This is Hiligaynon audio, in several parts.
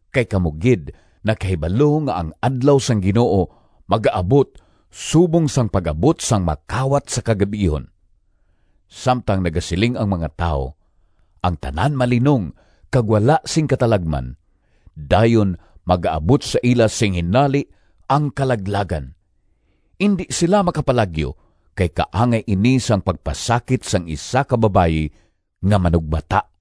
Kay kamo gid nakahibalo nga ang Adlaw sang Ginoo magaabot subong sang pag-abot sang makawat sa kagab-ihon. Samtang nagasiling ang mga tawo, “Ang tanan malinong kag wala sing katalagman,” dayon magaabot sa ila sing hinali ang kalaglagan! Indi sila makapalagyo, kay kaangay ini sang pagpasakit sang isa ka babayi nga manugbata.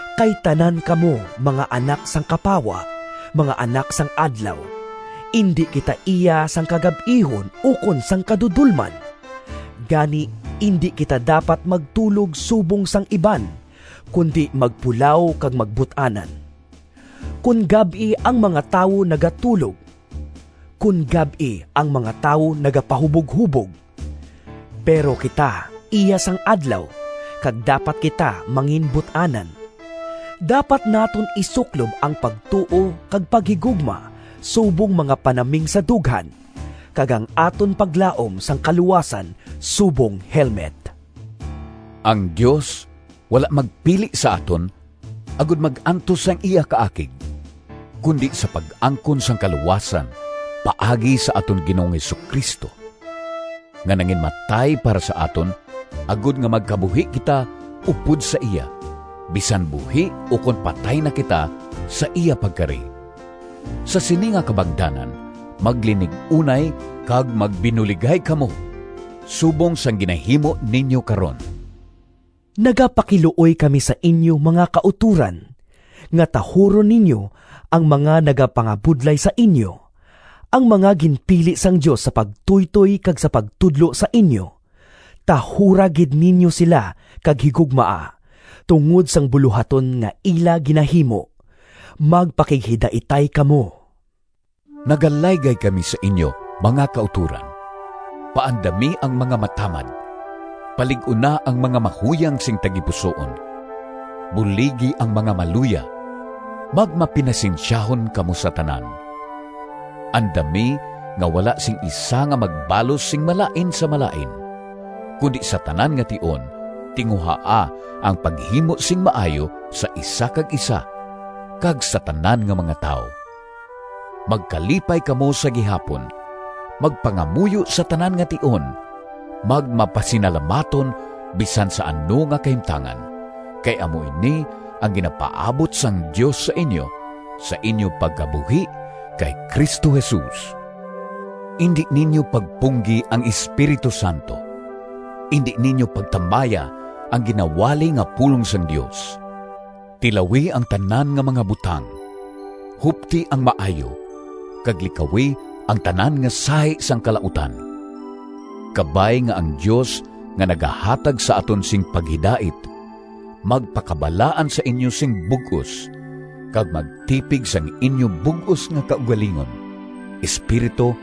Kay tanan kamo mga anak sang kapawa, mga anak sang adlaw. Indi kita iya sang kagab-ihon ukon sang kadudolman. Gani, indi kita dapat magtulog subong sang iban, kundi magpulaw kag magbut-anan. Kon gab-i ang mga tawo nagatulog; kon gab-i ang mga tawo nagapahuboghubog. Pero kita iya sang adlaw, kag dapat kita manginbut-anan. Dapat naton isuklob ang pagtuo kag paghigugma subong mga panaming sa dughan, kag ang aton paglaom sang kaluwasan subong helmet. Ang Dios wala magpili sa aton agod mag-antos sang iya kaakig, kundi sa pag-angkon sang kaluwasan paagi sa aton Ginoong Jesu-Cristo, nga nanginmatay para sa aton agod nga magkabuhi kita upod sa iya, bisan buhi ukon patay na kita sa iya pagkari. Sa sini nga kabangdanan maglinig-unay kag magbinuligay kamo subong sang ginahimo ninyo karon. Nagapakiluoy kami sa inyo, mga kautoran, nga tahuron ninyo ang mga nagapangabudlay sa inyo, ang mga ginpili sang Dios sa pagtuytoy kag sa pagtudlo sa inyo. Tahura gid ninyo sila kag higugmaa, tungod sang bulohaton nga ila ginahimo. Magpakighidaitay kamo. Nagalaygay kami sa inyo, mga kautoran: paandami ang mga matamad, palig-una ang mga mahuyang sing tagipusoon, buligi ang mga maluya, magmapinasensyahon kamo sa tanan. Andami nga wala sing isa nga magbalos sing malain sa malain, kundi sa tanan nga tion tinguhaa ang paghimo sing maayo sa isa kag isa kag sa tanan nga mga tawo. Magkalipay kamo sa gihapon, magpangamuyo sa tanan nga tion, magmapasinalamaton bisan sa ano nga kahimtangan kay amo ini ang ginapaabot sang Dios sa inyo, sa inyo pagkabuhi kay Cristo Jesus. Indi ninyo pagpunggi ang Espiritu Santo. Indi ninyo pagtamaya ang ginawali nga pulong sang Dios. Tilawi ang tanan nga mga butang, hupti ang maayo, kag likawi ang tanan nga sahi sang kalautan. Kabay nga ang Dios nga nagahatag sa aton sing paghidait, magpakabalaan sa inyo sing bug-os, kag magtipig sang inyo bug-os nga kaugalingon: espiritu,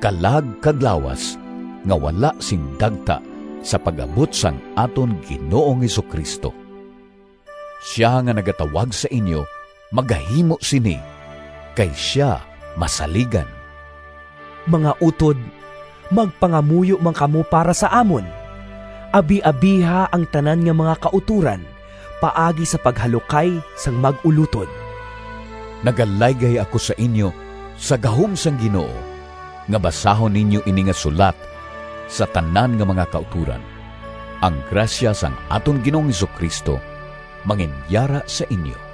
kalag, kag lawas, nga wala sing dagta sa pag-abot sang aton Ginoong Jesu-Cristo. Sia nga nagatawag sa inyo magahimo sini, kay sia masaligan. Mga utod, magpangamuyo man kamo para sa amon. Abiabiha ang tanan nga mga kautoran paagi sa paghalukay sang mag-ulotod. Nagalaygay ako sa inyo sa gahom sang Ginoo, nga basahon ninyo ini nga sulat sa tanan nga mga kautoran. Ang grasya sang aton Ginoong Jesu-Cristo manginyara sa inyo.